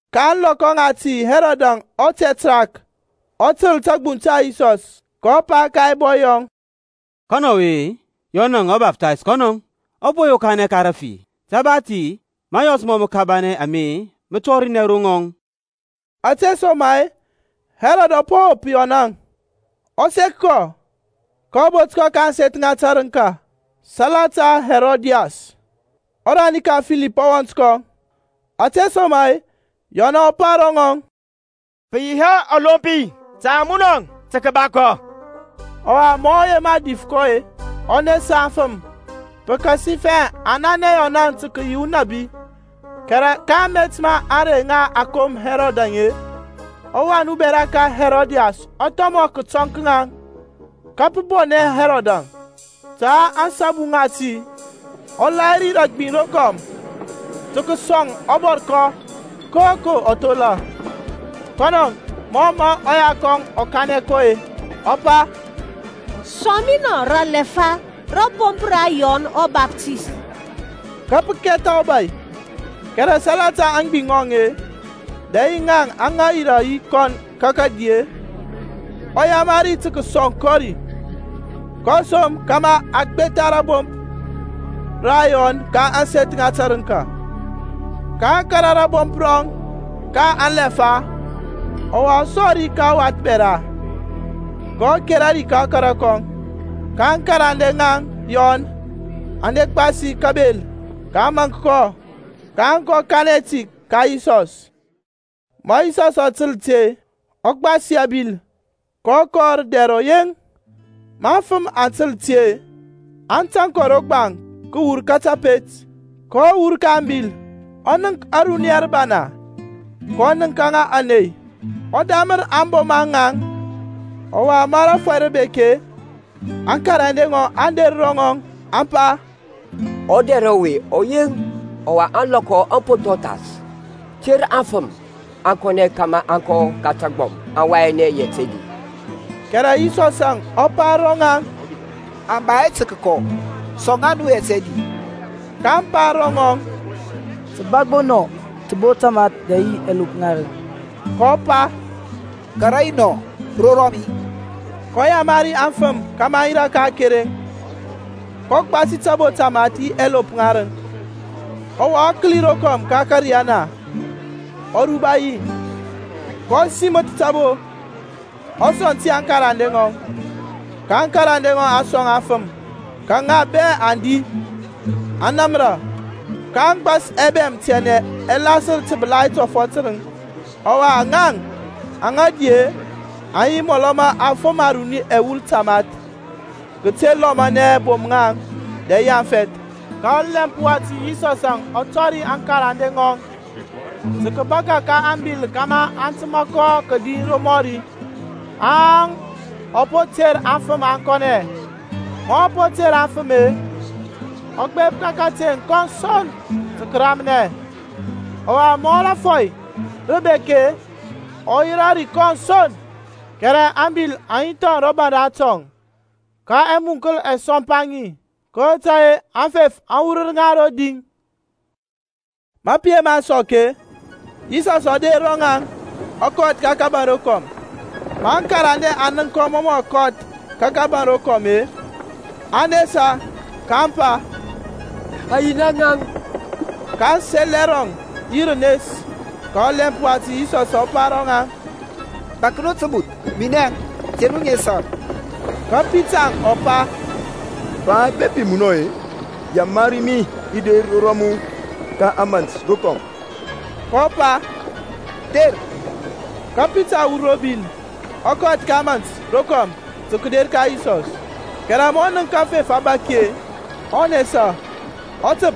Ka ȧŋlɔkɔ ŋati Herodȧŋ ɔtɛtrark ɔ tǝl tȧgbuŋ ta Yisɔs. kɔ pa ka ɛbɔy yɔŋ, Ɔwe-e, Yɔnȧŋ ɔBaftays kɔnɔȧŋ. Ɔ po yokanɛ ka rafi, te ba ti mȧyɔs mǝkabanɛ ame mǝ tɔrinɛ ro ŋɔŋ. Ȧtesoma-e Herodȧŋ ɔ po wop Yɔnȧŋ, ɔ sek kɔ, kɔ bot kɔ ka ȧŋseth ŋa tǝrǝŋka salata Herodias, ɔrani ka Filip ɔwɔnt kɔŋ. Ȧtesoma-e Yɔn ɔ pa ro ŋɔŋ, Pǝ yi hɛ ɔlompi ta munɔ tǝ kǝba kɔ. Ɔwa ma ɔ yema dif kɔ-e, ɔ nesa aŋfǝm, pǝkasifɛ aŋ nanɛ Yɔnȧŋ tǝ kǝyi unabi. Kɛrɛ ka amet ma ȧŋrey aŋa a kom Hɛrɔdȧŋ-e, ɔwan ubɛra ka Hɛrɔdiyȧs ɔ thɔmɔ kǝtɔŋ ka ŋaŋ, ka pǝ bɔnɛ Hɛrɔdȧŋ. Ta ȧŋsabu ŋati ɔ lahiri rǝ agbiŋ rokɔm tǝ kǝsɔŋ ɔbɔrkɔ koko ɔ thola. Kɔnɔŋ, mɔ mǝ ɔya kɔŋ ɔ kanɛ kɔ-e, ɔ pa, Sɔŋ mi nɔ rǝ alɛfa rȧbomp ra Yɔn ɔBaftays. Ka pǝ kɛtha ɔbȧy, kɛrɛ salata aŋgbiŋ ŋɔŋ-e, dɛ yi ŋaŋ aŋa yirȧ yi kɔn ka kǝdi-e, ɔ yamari tǝ kǝsɔŋ kɔ ri. kɔ som kȧmȧ a gbetha rȧbomp ra Yɔn ka ȧŋseth ŋa tǝrǝŋka. Ka a kȧrȧ rȧbomp rɔŋ ka alɛfa, ɔwa a sɔŋ ri ka ɔwath bɛra, kɔ kera ri ka ɔkara kɔŋ. Ka aŋkarande ŋa Yɔn aŋ de gbasi kabel, kaŋ maŋk kɔ, kaŋ kɔ kanɛ ti ka Yisɔs. Ma Yisɔsȧŋ ɔ tǝl ti-e, ɔ gbasi abil, kɔ kɔ rǝ dɛr ɔyeŋ. Ma aŋfǝm aŋ tǝl ti-e, aŋ tȧŋ kɔ ro gbaŋ kǝwur ka tapet. kɔ wur ka ȧŋbil, ɔ nənk ȧruniya rǝbana, kɔ nǝŋka ŋa ȧney, ɔ damǝr aŋboma ŋaŋ. Ɔwa ma rȧfɔy rǝ bek-e, aŋkarande ŋɔŋ aŋ der ro ŋɔŋ, aŋ pa, Ɔdɛr ɔwe ɔ yeŋ, ɔwa ȧŋlɔkɔ aŋ po thɔŋ thas. Ter aŋfǝm aŋ kɔnɛ, kȧmȧ aŋ kɔ ka tagbɔm, aŋ wayanɛ yɛt ɛdi. Kɛrɛ Yisɔsȧŋ ɔ pa ro ŋaŋ, Aŋ ba hɛ tǝ kǝkɔ, sɔŋ ŋa nu yɛt ɛdi. kaŋ pa ro ŋɔŋ, Sǝ ba gbo anɔ tǝbo tamath dɛ yi ɛlop ŋarǝŋ. kɔ pa, Kara yi nɔ ro rɔmi. kɔ yamari aŋfǝm kȧmȧ aŋ yirȧ ka akereŋ, kɔ gbasi tabo tamath yi ɛlop ŋarǝŋ, ɔwa ɔ kǝli rokɔm ka ȧkȧriyana, ɔ ruba yi, kɔ simǝth tabo, ɔ sɔŋ ti aŋkarande ŋɔŋ, ka aŋkarande aŋ sɔŋ aŋfǝm. Ka ŋa bɛ aŋ di, aŋ namra. Kaŋ gbas ɛbɛm ɛtianɛ aŋ lasǝr tǝbǝlai tɔfɔt tǝrǝŋ. Ɔwa ŋaŋ aŋa di-e, aŋ yi mɔlɔ ma afǝm aruni ɛwul tamath kǝte lɔmanɛ bom-ŋaŋ dɛ yi afɛth. Ka ɔlɛmp wati Yisɔsȧŋ ɔ tɔri aŋkarande ŋɔŋ tǝ kǝbaka ka ȧŋbil kȧmȧ aŋ tǝma kɔ kǝdi romɔri, haŋ ɔ po ter aŋfǝm aŋ kɔnɛ. Ma ɔ po ter aŋfǝm-e, ɔ gbep ka kateŋ, kɔn son tǝ kǝramnɛ. Ɔwa ma rȧfɔy rǝ bek-e, ɔ yirȧ ri kɔn son. Kɛrɛ ȧŋbil aŋ yi thɔŋ ro baŋ ratɔŋ, ka ɛmuŋkǝl ɛ sɔmpa ŋi, kotȧy-e aŋfef aŋ wurǝr ŋa rodi. Ma pǝ yema sɔk-e, Yisɔsȧŋ ɔ der ro ŋaŋ, ɔ kɔth ka kȧbȧŋ rokɔm. Ma aŋkarande aŋ nənk kɔ mɔ mǝ ɔ kɔth ka kȧbȧŋ rokɔm-e, aŋ nesa, kaŋ pa, Ayina ŋaŋ. Kaŋ sel ɛrɔŋ yi rǝnes. Ka ɔlɛmp wati Yisɔsȧŋ ɔ pa ro ŋaŋ, Bȧk nu tǝbuth; minɛȧŋ. Te nu nesa. Ka Pitarȧŋ ɔ pa, Pa, bepi munɔȧŋ-e, yamari mi i der ro rɔmu ka ȧmȧnt rokɔm. kɔ pa, Der. Ka Pitarȧŋ ɔ wur ro bil, ɔ kɔth ka ȧmȧnt rokɔm tǝ kǝder ka Yisɔs. Kɛrɛ ma ɔ nənk aŋfef abȧki-e, ɔ nesa. Ɔ tǝp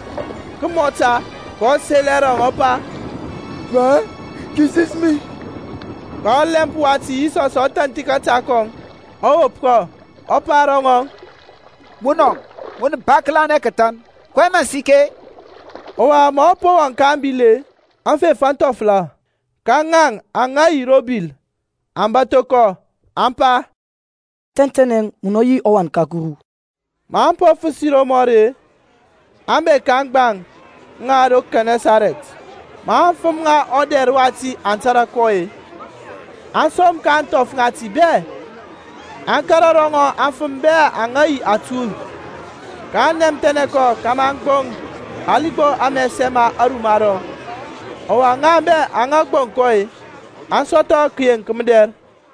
kǝmɔta, kɔ sel ɛrɔŋ ɔ pa, Pa, kisis mi. Ka ɔlɛmp wati Yisɔsȧŋ ɔ thanthi kȧta kɔŋ, ɔ wop kɔ, ɔ pa ro ŋɔŋ, Munɔ, mun ba kǝlanɛ kǝthan, kɔyɛŋ mǝ sikɛ-e? Ɔwa maŋ po wɔŋ ka ȧŋbil-e, aŋfef aŋ thɔfɔla. Ka ŋaŋ aŋa yi ro bil aŋ bȧtho kɔ, aŋ pa, Tɛntɛnɛ munɔ yi ɔWan ka Kuru. Maŋ po fǝsi romɔri-e, aŋ bek ka aŋgbaŋ ŋa ro Kɛnɛsarɛt. Ma aŋfǝm ŋa ɔdɛr wati aŋ tȧrȧ kɔ-e, aŋ som ka ȧŋthɔf ŋati bɛ, aŋ kȧrȧ ro ŋɔŋ aŋfǝm bɛ aŋa yi atuy. kaŋ nɛmthɛnɛ kɔ kȧmȧ aŋ gboŋ hali gbo amɛsɛ ma aruma rɔŋ. Ɔwa ŋaŋ bɛ aŋa gboŋ kɔ-e, aŋ sɔthɔ kǝyeŋk mǝdɛr.